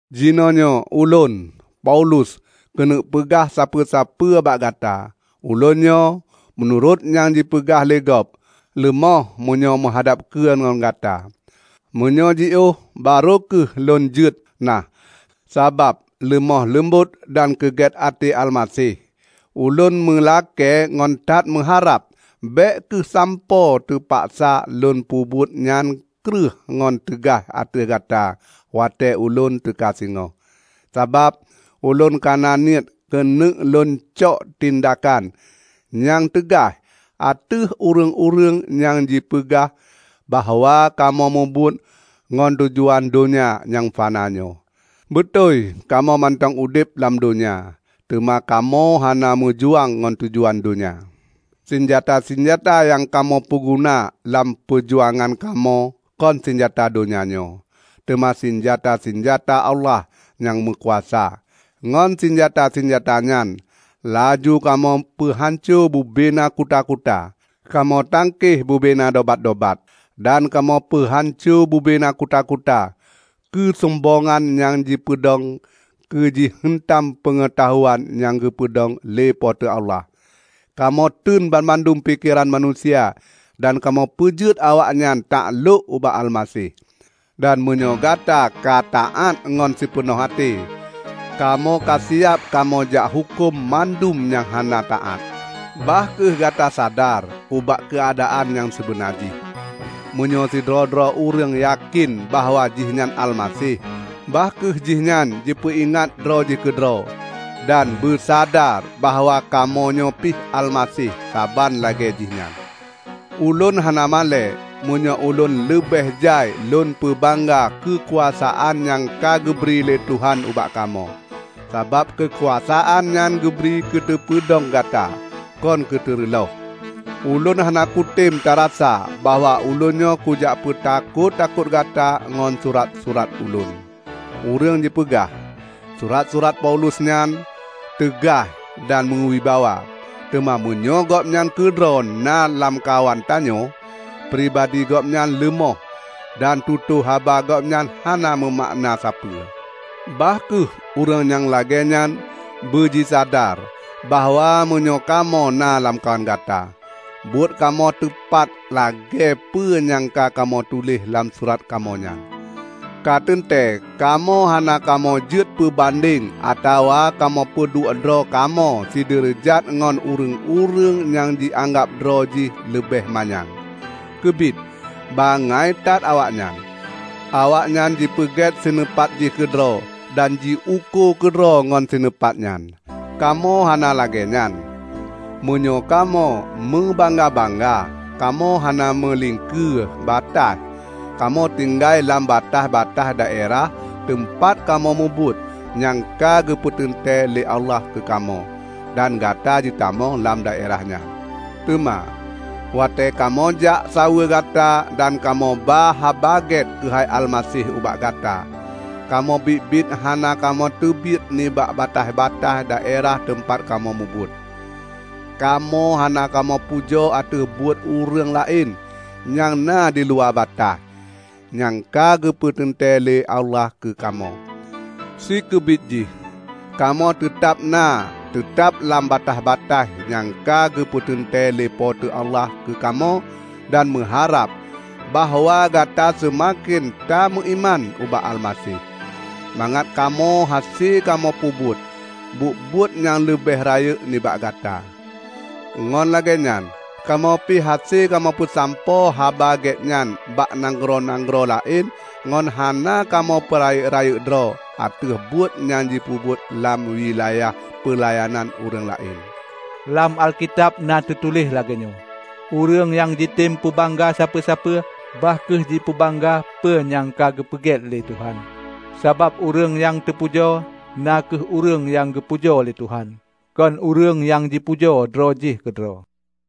Jinoenyoe ulôn, Paulus, keuneuk peugah sapeue-peue bak gata. Ulôn nyoe, meunurot nyang jipeugah lé gob, leumoh meunyoe meuhadab keu ngon gata, meunyoe jiôh barô kheueh lôn jeuet. Nah, sabab leumoh leumbot dan keu gét até Almaseh, ulôn meulakée ngon that meuharab bék kheueh sampoe teupaksa lôn peubuet nyan kreueh ngon teugaih ateueh gata watée ulôn teuka singoh. Sabab ulôn kana niet keuneuk lôncok tindakan nyang teugaih ateueh ureuëng-ureuëng nyang jipeugah bahwa kamoe mubuet ngon tujuan donya nyang fana nyoe. Beutôi kamoe mantong udeb lam donya, teuma kamoe hana meujuang ngon tujuan donya. Sinjata-sinjata nyang kamoe peuguna lam peujuangan kamoe kon sinjata donya nyoe, teuma sinjata-sinjata Allah nyang meukuasa. Ngon sinjata-sinjata nyan laju kamoe peuhanco bubena kuta-kuta; kamoe tangkeh bubena dobat-dobat dan kamoe peuhanco bubena kuta-kuta keusombongan nyang jipeudong keu jiheuntam peungeutahuan nyang geupeudong lé Po teu Allah. Kamoe teun mandum pikeran manusia dan kamoe peujeuet awaknyan taklôk ubak Almaseh. Dan meunyoe gata ka taát ngon sipeunoh até, kamoe kasiab kamoe jak huköm mandum nyang hana taát. Bah kheueh gata sadar ubak keuadaan nyang sibeuna jih. Meunyoe sidroe-droe ureuëng yakén bahwa jihnyan Almaseh, bah kheueh jihnyan jipeuingat droe jih keudroe dan beusadar bahwa kamoe nyoe pih Almaseh saban lagée jih nyan. Ulôn hana malée meunyoe ulôn leubeh jai lôn peubangga keukuasaan nyang ka geubri lé Tuhan ubak kamoe, sabab keukuasaan nyan geubri keuteupeudong gata, kon keuteureuloh. Ulôn hana kutem tarasa bahwa ulôn nyoe kujak peutakot-takot gata ngon surat-surat ulôn. Ureuëng jipeugah, "Surat-surat Paulus nyan teugaih dan meuwibawa, teuma meunyoe gobnyan keudroe na lamkawan tanyoe, pribadi gobnyan leumoh dan tutoe haba gobnyan hana meumakna sapeue!" Bah kheueh ureuëng nyang lagée nyan beujisadar bahwa meunyoe kamoe na lamkawan gata, buet kamoe teupat lagée peue nyang ka kamoe tuléh lam surat kamoe nyan. Ka teuntée kamoe hana kamoe jeuet peubandeng atawa kamoe peuduek droe kamoe sideureujat ngon ureuëng-ureuëng nyang jianggab droe jih leubeh manyang. Keubiet bangai that awaknyan! Awaknyan jipeugét sineupat jih keudroe dan jiukô keudroe ngon sineupat nyan. Kamoe hana lagée nyan. Meunyoe kamoe meubangga-bangga, kamoe hana meuliengkeu bataih. Kamoe tinggai lam bataih-bataih daerah teumpat kamoe mubuet nyang ka geupeuteuntée lé Allah keu kamoe. Dan gata jitamong lam daerah nyan. Teuma, watée kamoe jak saweue gata dan kamoe ba Haba Gét keuhai Almaseh ubak gata, kamoe biet-biet hana kamoe teubiet nibak bataih-bataih daerah teumpat kamoe mubuet. Kamoe hana kamoe pujoe ateueh buet ureuëng laén nyang na diluwa bataih nyang ka geupeuteuntée lé Allah keu kamoe. Sikeubiet jih kamoe teutab na teutab lam bataih-bataih nyang ka geupeuteuntée lé Po teu Allah keu kamoe dan meuharab bahwa gata seumaken tameuiman ubak Almaseh, mangat kamoe hase kamoe peubuet buet-buet nyang leubeh rayeuk nibak gata. Ngon lagée nyan kamoe pih hase kamoe peusampoe Haba Gét nyan bak nanggroe-nanggroe laén ngon hana kamoe peurayeuk-rayeuk droe ateueh buet nyang jipeubuet lam wilayah peulayanan ureuëng laén. Lam Alkitab na teutuléh lagée nyoe, "Ureuëng nyang jitem peubangga sapeue-sapeue, bah kheueh jipeubangga peue nyang ka geupeugét lé Tuhan." Sabab ureuëng nyang teupujoe na kheueh ureuëng nyang geupujoe lé Tuhan, kon ureuëng nyang jipujoe droe jih keudroe.